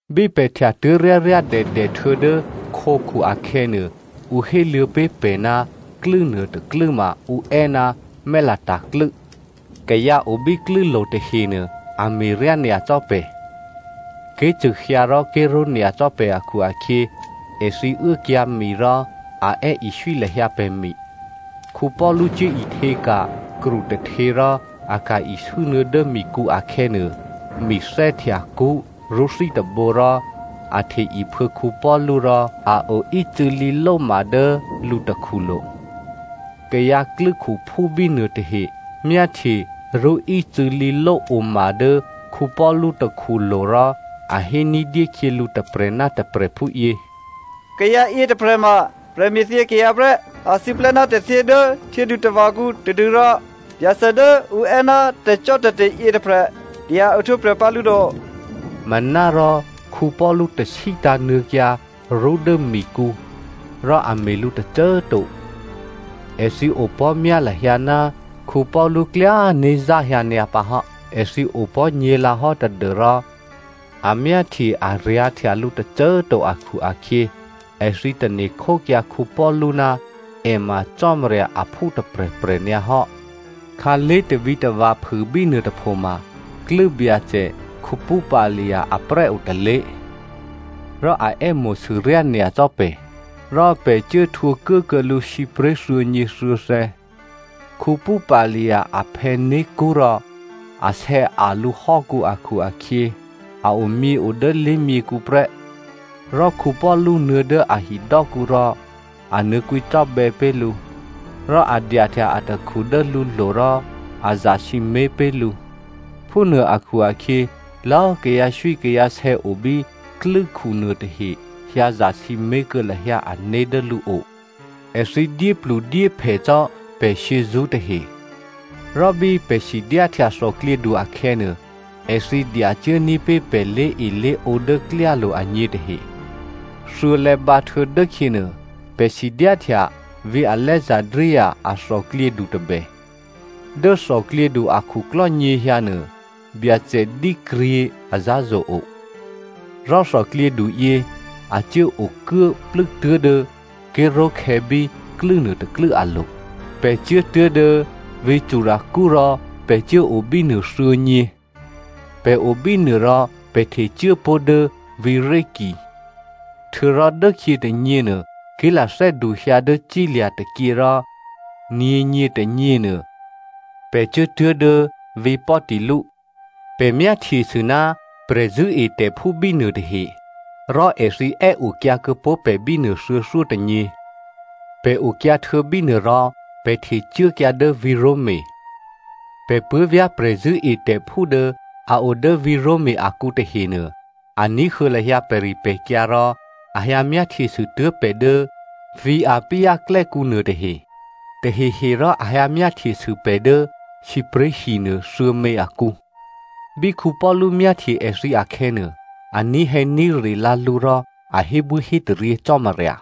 Bí pè̤ htyatuố̤ ryáryádèdè htuô̌dố khǒkhu akhè̌nuô, ǔ héluô̌ pé̤ pè̤ ná klû́ nuôtôklû́ ma ǔ è́ ná Malta klû́. Kayǎ o bí klû́lo̤ tahenuô, a me̤ryá nyacò́ pè̤. Ké̤cṳ̂ hyǎ rò ké̤ró̤ nyacò́ pè̤ akhu-akhyě, èthǐ uốkyǎ̤mi rò a è́iswí lahyǎ pè̤ mi. Paulu cuố ihtěka̤ kru tôhtě rò a ka̤ isû́nuô̌ dố mikǔ akhè̌nuô, mi thè́htya kṳ́ rṳ́thí tôbǒ rò a hte iphuô̌ Paulu rò a oícû̌ lǐlóma dố lǔ takhulo̤. Kayǎ klû́khuphú bínuô tahe myáhtye rṳ́ ícû̌lǐlóoma dố Paulu takhulo̤ rò a hé ní̤dyé khyělǔ tôprè̤ ná tôprè̤ phúyě, “Kayǎ yětôprè̤ma prè̤me̤thyě kayǎ prè́. A siplè́ ná tè̤thyě dố htyědutava̤kǔ tadû́rò Byacè dố ǔ è́ ná tè̤cò́tè̤te̤ yětôprè̤ dya ohtwǒprè̤ pǎ lǔ to.” Manárò Paulu tasí tǎ̤nuô̌kyǎ rṳ́ dố mikǔ, rò a me̤ lǔ tôcô꤮ to. Èthǐ opò̤́ myá lahyǎ ná Paulu klyá né̤ záhyǎ nyǎ pǎ hò́. Èthǐ opò̤́ nyě̤lǎhò́ tadû́rò a myáhtye aryǎ̤ htya lǔ tôcô꤮ to akhu-akhyě, èthǐ tane̤ khókyǎ Paulu ná è ma cò́marya aphú tôprè̤prè̤ nyǎ hò́. Khǎlé̤ tavǐtava̤ phû bínuôtôpho ma, klû́byacè Publio aprè́ o tôlé̤. Rò a è́mo̤sû ryányacò́ pè̤, rò pè̤ cuố htwǒ kuốkuô̌ lǔ sǐpré̤ thuô̌nyěthuô̌thè̌. Publio aphè̌ né̤kṳ́ rò a sè̌a̤ lǔhò́kǔ akhu-akhyě a omyěo dố lé̤myěkhu prè́. Rò Paulu nuô̌ dố a hidò́kǔ rò, a nuô̌ kwǐcò́bè̌ pé̤ lǔ, rò a dyahtya atakhu dố lǔlo̤ rò a zasǐmé̤ pé̤ lǔ. Phúnuô akhu-akhyě, lò̌꤮ kayǎswíkayǎsè̌ o bí klû́khu nuôtahe hyǎ zasǐmé̤ kuô̌ lahyǎ ané̤ dố lǔo. Èthǐ dyépludyéphè cò́ pè̤ shyězṳ́ tahe, rò bí pè̤ sidyáhtya thòklyědu akhè̌nuô, èthǐ dyacuốní̤ pé̤ pè̤ lé̤elé̤ǒ dố klyálo̤ agně tahe. Thuô̌lè̌ bǎhtuô̌ dốkhyěnuô, pè̤ sidyáhtya vǐ̤ Alexandria a thòklyědu tôbè. Dố thòklyědu akhuklò́ nyěhyǎnuô byacè dǐkryě azǎ̤zo̤ o. Rò thòklyědu yě a cuố okuố plû́tuố̤ dố ké̤ró̤khè̌ bí klû́ nuôtôklû́ alo̤. Pè̤ cuốtuố̤ dố vǐ̤ Syracuse rò pè̤ cuốo bínuô thuô̌nyě. Pè̤ o bínuô rò pè̤ htecuố pó̤ dố vǐ̤ Rhegio. Htuô̌rò dốkhyě tônyěnuô, ké̤lathè́ duhyǎ dố cílya̤ tôkyě rò nyě̤nyětônyě nuô pè̤ cuốtuố̤ dố vǐ̤ Peteoli. Pè̤ myáhtyesû ná prè̤zṳ̂́etè̤phú bínuô tahe, rò èthǐ è́okyǎ kuô̌pó̤ pè̤ bínuô thuô̌thyótônyě. Pè̤ okyǎ htuô̌ bínuô rò pè̤ htecuốkyǎ dố vǐ̤ Roma. Pè̤ puố̤vyá̤ prè̤zṳ̂́etè̤phú dố a o dố vǐ̤ Roma akǔ tahenuô, a ní̤huô̌ lahyǎ pè̤ripè̤kyǎ rò a hyǎ myáhtyesû tuố̤ pè̤ dố vǐ̤ Appio klè́kǔ nuô tahe, taheherò a hyǎ myáhtyesû pè̤ dố sǐpré̤hi nuô thuô̌mě akǔ. Bí Paulu myáhtye èthǐ akhè̌nuô, a ní̤hè̌ní̤re lǎ lǔ rò a hébwíhétaryě Cò́marya.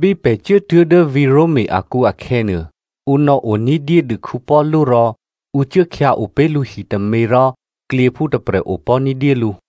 Bí pè̤ cuốtuố̤ dố vǐ̤ Roma akǔ akhè̌nuô, ǔ nò̌o ní̤dyédû Paulu rò ǔ cuốkhyǎo pé̤ lǔ hitômě rò klyěphú tôprè̤ opò̤́ ní̤dyé lǔ.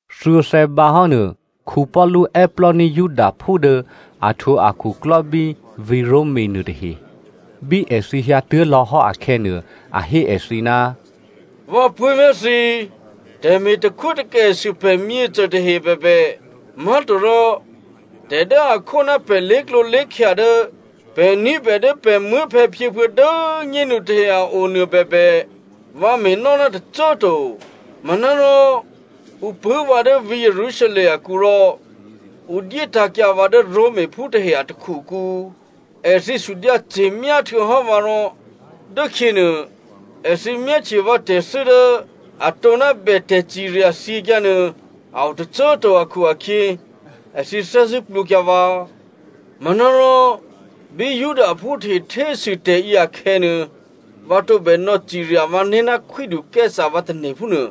Thuô̌thè̌ bǎhò́nuô, Paulu è́plò́ní̤ Judaphú dố a htwǒ akhuklò́ bí vǐ̤ Roma nuôtahe. Bí èthǐ hyǎtuố̤ lò̌hò́ akhè̌nuô, a hé èthǐ, “Vǎ puố̤vyá̤ thǐ꤮, tè̤me̤ takhwótakèsû pè̤ myěcô tahe bèbè, má̤torò tè̤ dố a khó ná pè̤ lé̤klǒlé̤khya dố pè̤ ní̤bè dố pè̤ muố̤phè̌phyěphuô̌ dố꤮ nyénu tahe a o nuô bèbè, vǎ me̤nò́ ná tôcô꤮ to. Manárò ǔ pṳ̂́ vǎ dố vǐ̤ Jerusalem akǔ rò ǔ dyétǎ̤kyǎ vǎ dố Romaphú tahe a takhukǔ. Èthǐ sudyǎce̤myá htuô̌hò́ vǎ rò dốkhyěnuô, èthǐ myáhtye vǎ tè̤thû́ dố atǒ ná bè tè̤cirya thyěkyǎnuô a o tôcô꤮ to akhu-akhyě, èthǐ thè́zṳ̂́ plwǒkyǎ vǎ. Manárò bí Judaphú tahe htésû tè̤yě akhè̌nuô, vǎ tǒbè nò̌cirya vǎné̤ ná Khwídu Caesare vǎ tane̤ phúnuô.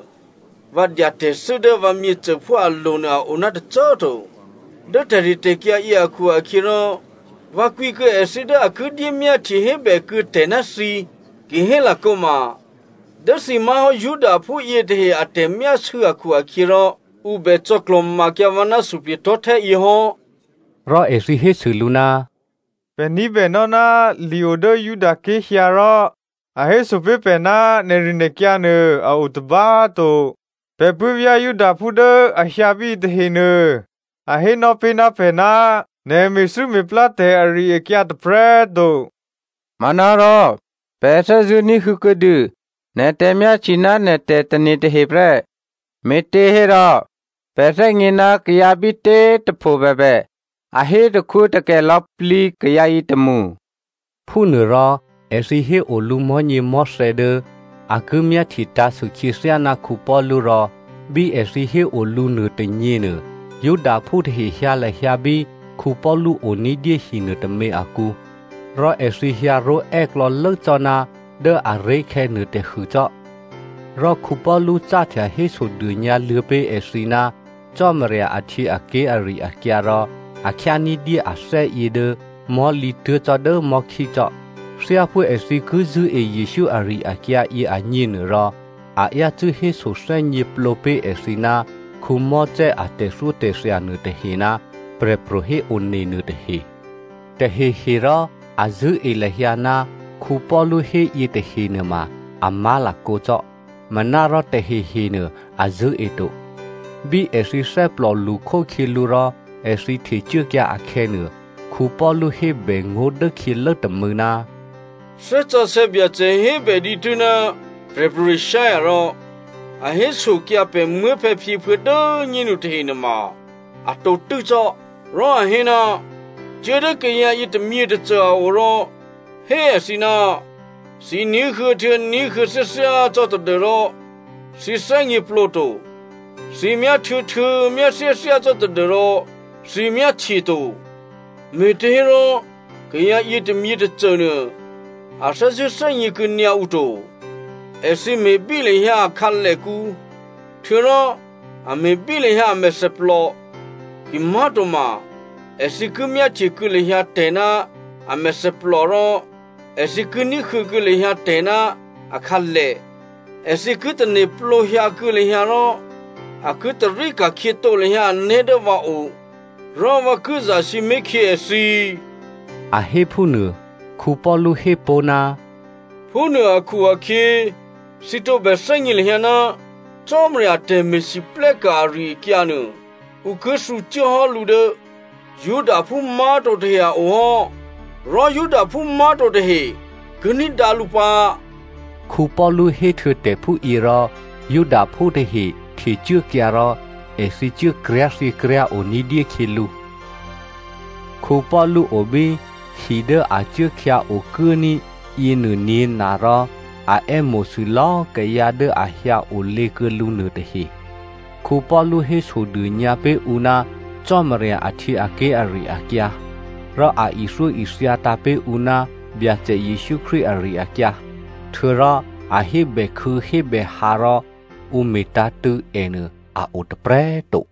Vǎ dya tè̤thû́ dố vǎ myěcôphú alo̤ nuô a o ná tôcô꤮ to. Dố tè̤ritè̤kyǎ yě akhu-akhyěrò, vǎ kwǐ kuô̌ èthǐ dố a ki dyémyáhtye hébèkuô̌ tè̤ ná thǐ. Kihélakǒma dố thǐ má̤hò́ Judaphú yětahe a tè̤myásû̌ akhu-akhyěrò ǔ bè cò̌klò̤makyǎ vǎ ná suplye̤tò̤́htè́ yě hò́.” Rò èthǐ hésû lǔ, “Pè̤ ní̤bènò́ ná li o dố Judaké̤ hyǎ rò a héso pé̤ pè̤ ná nè̤rinè̤kyǎ nuô a o tôba꤮ to. Pè̤ puố̤vyá̤ Judaphú dố a hyǎ bíyě tahenuô, a hénò́ pé̤ ná pè̤ ná nè̤ me̤thû́me̤plátè̤ ari-akyǎ tôprè̤꤮ to. Manárò pè̤ thè́zṳ̂́ ní̤huô̌ kuô̌dû nè̤ tè̤myáhtye ná nè̤ tè̤tane̤ tahe prè́, me̤těhérò, pè̤ thè́gně ná kayǎ bítě꤮ tôpho bèbè a hé takhwótakè lò̌plǐ kayǎ yětômṳ.” Phúnuôrò èthǐ héo lǔ mò̤́nyěmò̤́thè̌ dố a ki myáhtye tǎ̤sû khyěthyá ná Paulu rò bí èthǐ héo lǔ nuôtônyěnuô, Judaphú tahe hyǎ lahyǎ bí Paulu o ní̤dyé hi nuôtômě akǔ, rò èthǐ hyǎró̤ è́klò̌lố cò́ ná dố aré̤khè̌ nuôtôhû cò́. Rò Paulu cáhtya hésodônyǎluô̌ pé̤ èthǐ ná Cò́marya ahtyěaké̤ ari-akyǎ rò a khyá ní̤dyé athè́yě dố mò̤́lǐ tuố̤ cò́ dố mò̤́khí cò́. Thyáphú èthǐ ki zṳ̂́e Jesǔ ari-akyǎ yěagněnuôrò, a yácû́ hésothè́gněplǒ pé̤ èthǐ ná Mosè a tè̤thyótè̤thya nuôtahe ná prè̤pro̤ héone nuôtahe. Tahehe rò a zṳ̂́e lahyǎ ná Paulu hé yětahe nuôma a má̤lakǒ cò́, manárò tahehenuô a zṳ̂́e to. Bí èthǐ thè́plò lṳkhókhyělǔ rò èthǐ htecuốkyǎ akhè̌nuô, Paulu hébè ngó̤ dốkhyělố tômû̌, “Thè́ Sǎsè̌ Byacè hébè dǐtû́ ná Prè̤pro̤ Isaiah rò a hésokyǎ pè̤ muố̤phè̌phyěphuô̌ dố꤮ nyénu tahe nuôma a tǒtû́ cò́. Rò a hé, ‘Cuố dố kayǎ yě tômyětôcô a o rò hé èthǐ, “Thǐ ní̤huô̌ htuô̌ ní̤huô̌ thyáthyá cò́ tadû́rò thǐ thè́gněplǒto. Thǐ myáhtuô̌htuô̌ myáthyáthyá cò́ tadû́rò thǐ myáhtyeto.” Me̤těhérò kayǎ yětômyětôcô nuô, a thè́zṳ̂́ thè́gně kuô̌nyǎ ǔ to. Èthǐ me̤bí lahyǎ a khǎlèkǔ, htuô̌rò a me̤bí lahyǎ a mèthèplò. Kimá̤toma, èthǐ ki myáhtye kuô̌ lahyǎ tè̤ ná a mèthèplò, rò èthǐ ki ní̤huô̌ kuô̌ lahyǎ tè̤ ná akhǎlè, èthǐ ki tane̤plǒ hyǎkuô̌ lahyǎ rò a ki tarí ka̤khyětǒ lahyǎ ané̤ dố vǎ o, rò vǎ ki zasǐmé̤ khyě èthǐ.’” A hé phúnuô. Paulu hé pó̤, “Phúnuô akhu-akhyě thǐ tǒbè thè́gně lahyǎ, Cò́marya a tè̤me̤lwóhteka̤ ari-akyǎ nuô, ǔ ki thǔcuốhò́ lǔ dố Judaphú má̤to tahe a o hò́, rò Judaphú má̤to tahe ki ní̤dǎ lǔ pǎ.” (Paulu héhtuô̌ tè̤ phúyě rò, Judaphú tahe htecuốkyǎ rò èthǐ cuố kryá̤thyěkryá̤o ní̤dyé khyělǔ.) Paulu o bí hi dố a cuố khyǎ okuốní̤ yěnuô nyě̤na rò a è́mo̤sû lò̌꤮ kayǎ dố a hyǎ olě kuô̌ lǔ nuôtahe. Paulu hésodônyǎ pé̤ ǔ ná Cò́marya ahtyěaké̤ ari-akyǎ, rò a ithyóithyatǎ̤ pé̤ ǔ ná Byacè Jesǔ Krístu ari-akyǎ. Htuô̌rò a hébèkhû̌hébèhǎ rò ǔ me̤tǎ̤tṳ̂̌ ènuô a o tôprè̤꤮ to.